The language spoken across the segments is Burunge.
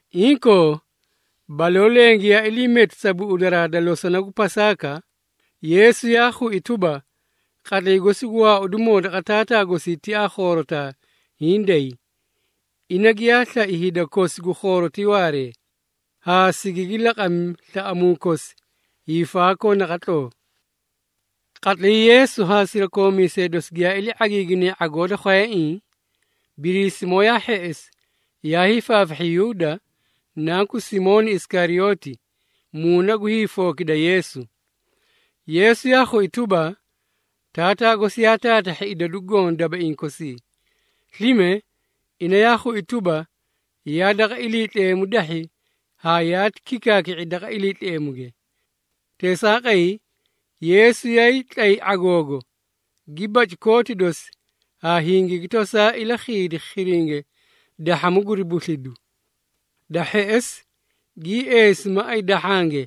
Inkoo, baloo leẽ giyaa ilii meti sa buꞌudaraa da losona gu Pasaaka, Yeesu yaa khui tuba, qatlay gosi gu waaudimoo daqa Taataa gosi tiaa khoorotaa hiĩ day. Ina giyaa slai hida kosi gu khoorotii waaree, haa sigigi laqami slaꞌamuu kosi hiifaakoo naqatloo. Qatlay Yeesu haa sirakoomiisee dosi giyaa ilii ⁄agiiginee ⁄agoo da khwayaiĩ, Biriisimoo yaa hheꞌesi yaa hiifaafahhi Yuuda, nanku Simooni Isikariyooti, muuna gu hiifookida Yeesu. Yeesu yaa khui tuba, Taataa gosi yaa taatahhi idadu goõ dabaiĩ kosii. Slime, ina yaa khui tuba, yaa daqa Iliitleemu dahhi haa yaati kikaaki⁄i daqa Iliitleemuge. Teesaaqay, Yeesu yaay tlay ⁄agoogo, gi baci kooti dosi haa hingigi tosaa ilakhiidi khiringe dahhamu guri buslidu. Da hheꞌesi, gii eesi maꞌay dahhange,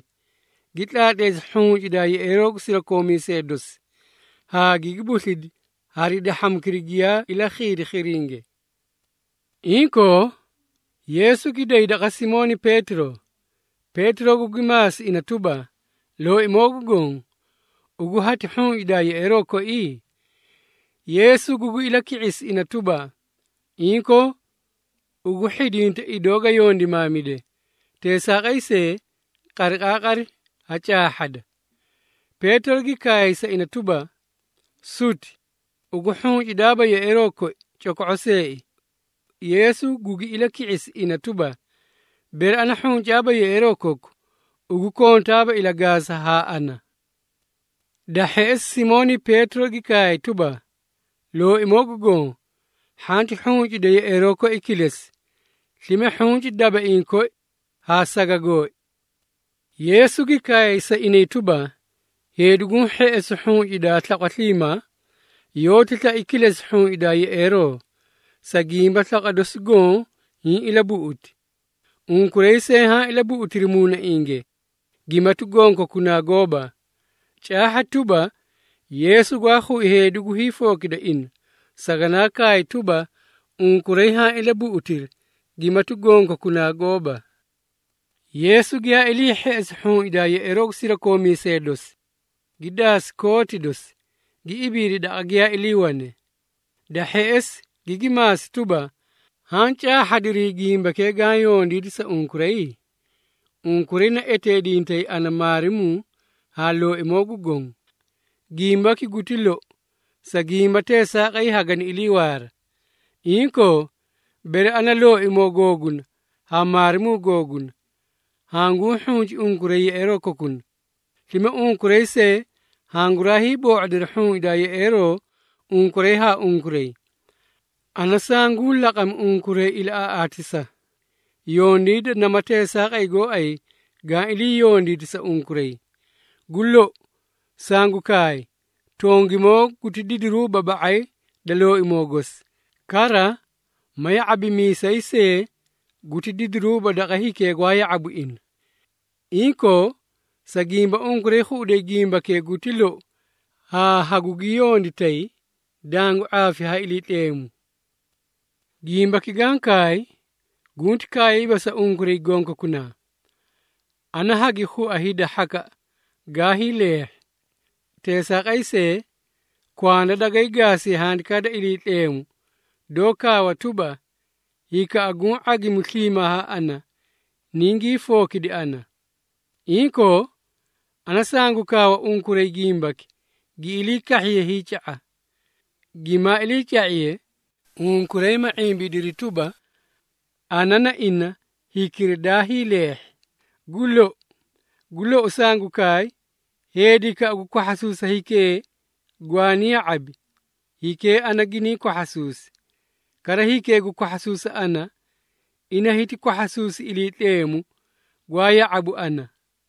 gi tlaatleesi hhuncindaa yeꞌeeroo gu sirakoomiisee dosi, haa gigi buslidi hari dahhamukira giyaa ilakhiidi khiringe. Inkoo, Yeesu gi day daqa Simooni Peetiro, Peetiro gugi maasi ina tuba, “Looimoo gu Goõ, ugu hati hhuncidaa yeꞌeeroo koi?” Yeesu gugi ilaki⁄isi ina tuba, “Inkoo, ugu hhidinta idoo ga yondimaamide, teesaaqay see, qariqaaqari hacaahhada.” Peetiro gi kaay sa ina tuba, “Suti, ugu hhuncidaaba yeꞌeeroo koi coko⁄o see!” Yeesu gugi ilaki⁄isi ina tuba, “Bere ana hhuncaaba yeꞌeeroo koku, ugu kontaaba ilagaasa haa ana.” Da hheꞌesi Simooni Peetiro gi kaay tuba, “Looimoo gu Goõ, hhanti hhuncida yeꞌeeroo koi kilesi, slime hhunci dabaiĩ koi haa saga gooi!” Yeesu gi kaay sa inay tuba, “Heedi guũ hheꞌesu hhuncidaa slaqwa sliimaa, yoóti slai kilesi hhuncidaa yeꞌeeroo, sa gimba slaqwa dosi goõ hiĩ ilabuꞌuti. Unkuray see haã ilabuꞌutiri muunainge, gimati gonkokunaa gooba.” Caahha tuba, Yeesu gwaa khui heedi gu hiifookida ina, saganaa kaay tuba, “Unkuray haã ilabuꞌutiri, gimati gonkokunaa gooba.” Yeesu giyaa ilii hheꞌesi hhuncidaa yeꞌeeroo gu sirakoomiisee dosi, gi daasi kooti dosi, gi ibiidi daqa giyaa iliiwane. Da hheꞌesi, gigi maasi tuba, “Haã caahhadiri gimbakee gaã yondiidi sa unkuray? Unkuray naeteedintay ana ‘Maarimuu’ haa ‘Looimoo gu Goõ.’ Gimbaki guti louu, sa gimba teesaaqay hagani iliiwaara. Inkoo, bere ana, Looimoo googuna haa Maarimuu googuna, hanguu hhunci unkuray yeꞌeeroo kokuna, slime unkuray see hanguraa hiiboo⁄odiri hhuncidaa yeꞌeeroo unkuray haa unkuray. Ana sanguu laqami unkuray ilaꞌaaꞌaatisa, yondiida nama teesaaqay gooay gaã ilii yondiidi sa unkuray. Gu lou, sangu kaay, tongimoo guti didiruuba ba⁄ay da looimoo gosi. Kara, ma ya⁄abimiisay see guti didiruuba daqa hikee gwaa ya⁄abu ina. Inkoo, sa gimba unkuray khuꞌuday gimbakee guti lou haa hagugi yonditay, dangu ⁄aafi ha Iliitleemu. Gimbaki gaã kaay, gunti kaayiiba sa unkuray gonkokunaa. Ana hagi khua hida hhakaꞌa gaa hiileehhi. Teesaaqay see, kwanda dagay gaasiye Handikaa da Iliitleemu, doó kaawa tuba, ‘Hikaꞌa guũ ⁄agimu sliimaa haa ana, ningii fookidi ana.’ Inkoo, ana sangu kaawa unkuray gimbaki gi ilii kahhiye hiica⁄a, gimaa iliica⁄iye, unkuray ma ⁄imbidiri tuba, ana na ina hikira daa hiileehhi. Gu lou, gu lou sangu kaay, heedikaꞌa gu kwahhasuusa hikee gwaani ya⁄abi, hikee ana gini kwahhasuusi. Kara hikee gu kwahhasuusa ana, ina hiti kwahhasuusi Iliitleemu, gwaa ya⁄abu ana.”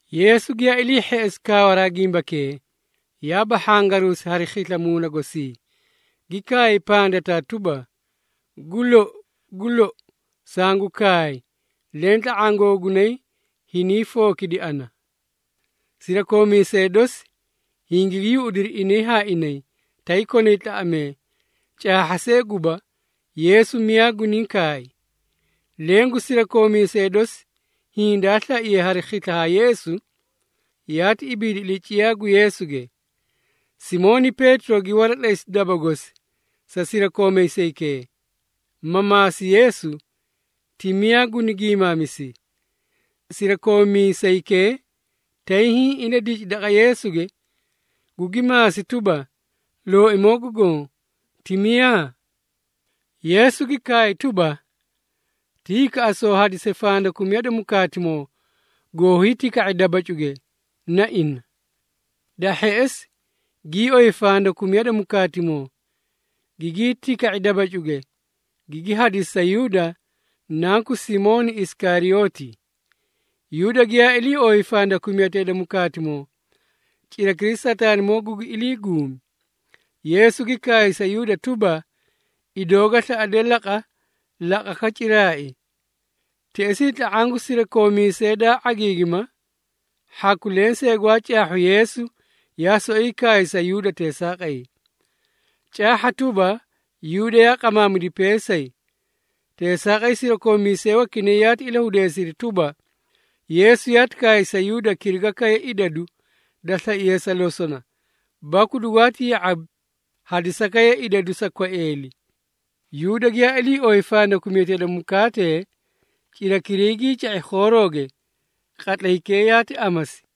Yeesu giyaa ilii hheꞌesi kaawaraa gimbakee, yaa bahhangaruusi hari khisla muuna gosi, gi kaay pandataa tuba, “Gu lou, gu lou, sangu kaay leẽ tla⁄aã googunay hiniĩ fookidi ana!” Sirakoomiisee dosi hingigi yuꞌudiri inay haa inay, tay konay tlaꞌamee, caahharaa see guba, Yeesu miyaa guniĩ kaay. Leẽ gu sirakoomiisee dosi, hiĩ daa slaiye hari khisla ha Yeesu, yaati ibiidi ilaciyaa gu Yeesuge. Simooni Peetiro gi waratlay daba gosi sa sirakoomiisaykee, ma maasi Yeesu, ti miyaa guni giimaamisi. Sirakoomiisaykee tay hiĩ iladici daqa Yeesuge, gugi maasi tuba, “Looimoo gu Goõ, ti miyaa?” Yeesu gi kaay tuba, “Ti hikaꞌa soo hadise fandakumiyati da mukaatimoo goo hiitika⁄e dabacuge, na ina.” Da hheꞌesi, gii oyi fandakumiya da mukaatimoo, gigii tika⁄i dabacuge, gigi hadisi sa Yuuda, nanku Simooni Isikariyooti. Yuuda giyaa ilii ooyi fandakumiyatee da mukaatimoo, cirakiray Sataanimoo gugi ilii guumi. Yeesu gi kaay sa Yuuda tuba, “Idoo ga slaꞌade laqa, laqaka ciraai!” Teꞌesii tla⁄aã gu sirakoomiisee daa ⁄agiigima, hhaku lensee gwaa caahhu Yeesu yaa soꞌoyi kaay sa Yuuda teesaaqay. Caahha tuba, Yuuda yaa qamaamidi peesay, teesaaqay sirakoomiisee wakinay yaati ilahudeesiri tuba, Yeesu yaati kaay sa Yuuda kirigiye idadu daa slaiye sa losona, baku dugwaati ya⁄abi hadisakaye idadu sa kwaeeli. Yuuda giyaa ilii ooyi fandakumiyatee da mukaatee, cirakiray gii ca⁄i khoorooge. Qatlaykee yaati amasi.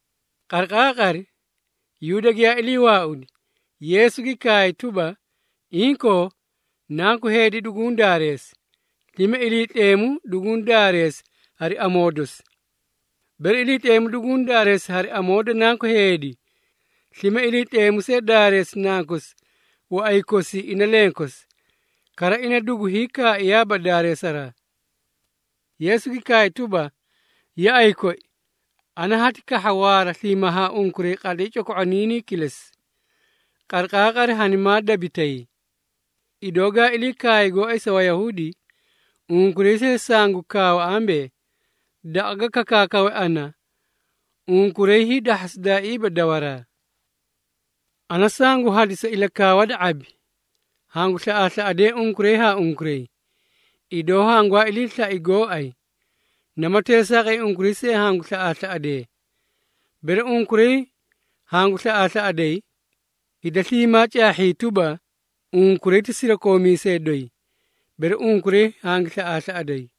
Qariqaaqari, Yuuda giyaa ilii waaudi, Yeesu gi kaay tuba, “Inkoo, Nanku Heedi duguũ daareesi, slime Iliitleemu duguũ daareesi hari amoo dosi. Bere Iliitleemu duguũ daareesi hari amoo da Nanku Heedi, slime Iliitleemu see daareesi Nankosi waꞌay kosii ina lenkosi, kara ina gu hiikaaiyaaba daareesaraa.” Yeesu gi kaay tuba, “Yaꞌay koi, ana hati kahha waara sliimaa haa unkuray qatlay coko⁄oniinii kilesi. Qariqaaqari hanimaa dabitay. Idoo gaa ilii kaay gooay sa Wayahuudi, unkuray see sangu kaawa ambee, ‘Daqa ga kakaakawe ana, unkuray hiidahhasidaaiiba dawaraa.’ Ana sangu hadisa ilakaawa da ⁄abi. Hangu slaꞌaaslaꞌadee unkuray haa unkuray, idoo hangwaa ilii slai gooay, nama teesaaqay unkuray see hangu slaꞌaaslaꞌadee. Bere unkuray hangu slaꞌaaslaꞌaday, hida sliimaa caahhiyay tuba, unkuray ti sirakoomiisee doyi, bere unkuray hangu slaꞌaaslaꞌaday.”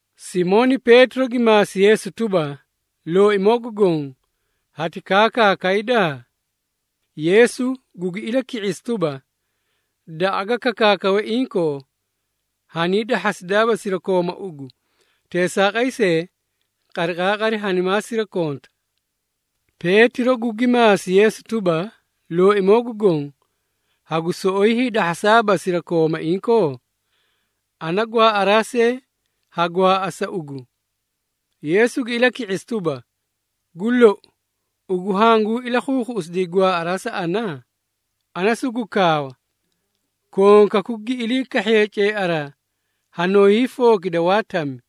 Simooni Peetiro gi maasi Yeesu tuba, “Looimoo gu Goõ, hati kaakaakayda?” Yeesu gugi ilaki⁄isi tuba, “Daqa ga kakaakawe inkoo, hanii dahhasidaaba sirakooma ugu. Teesaaqay see, qariqaaqari hanimaa sirakonta.” Peetiro gugi maasi Yeesu tuba, “Looimoo gu Goõ, hagu soꞌoyi hiidahhasaaba sirakooma inkoo? Ana gwaaꞌaraa see ha gwaaꞌa sa ugu!” Yeesu gi ilaki⁄isi tuba, “Gu lou, ugu hanguu ilakhuukhuꞌusidi gwaaꞌaraa sa ana? Ana sugu kaawa, konkaku gi ilii kahhiye ceearaa, hanoo hiifookita waa tami.”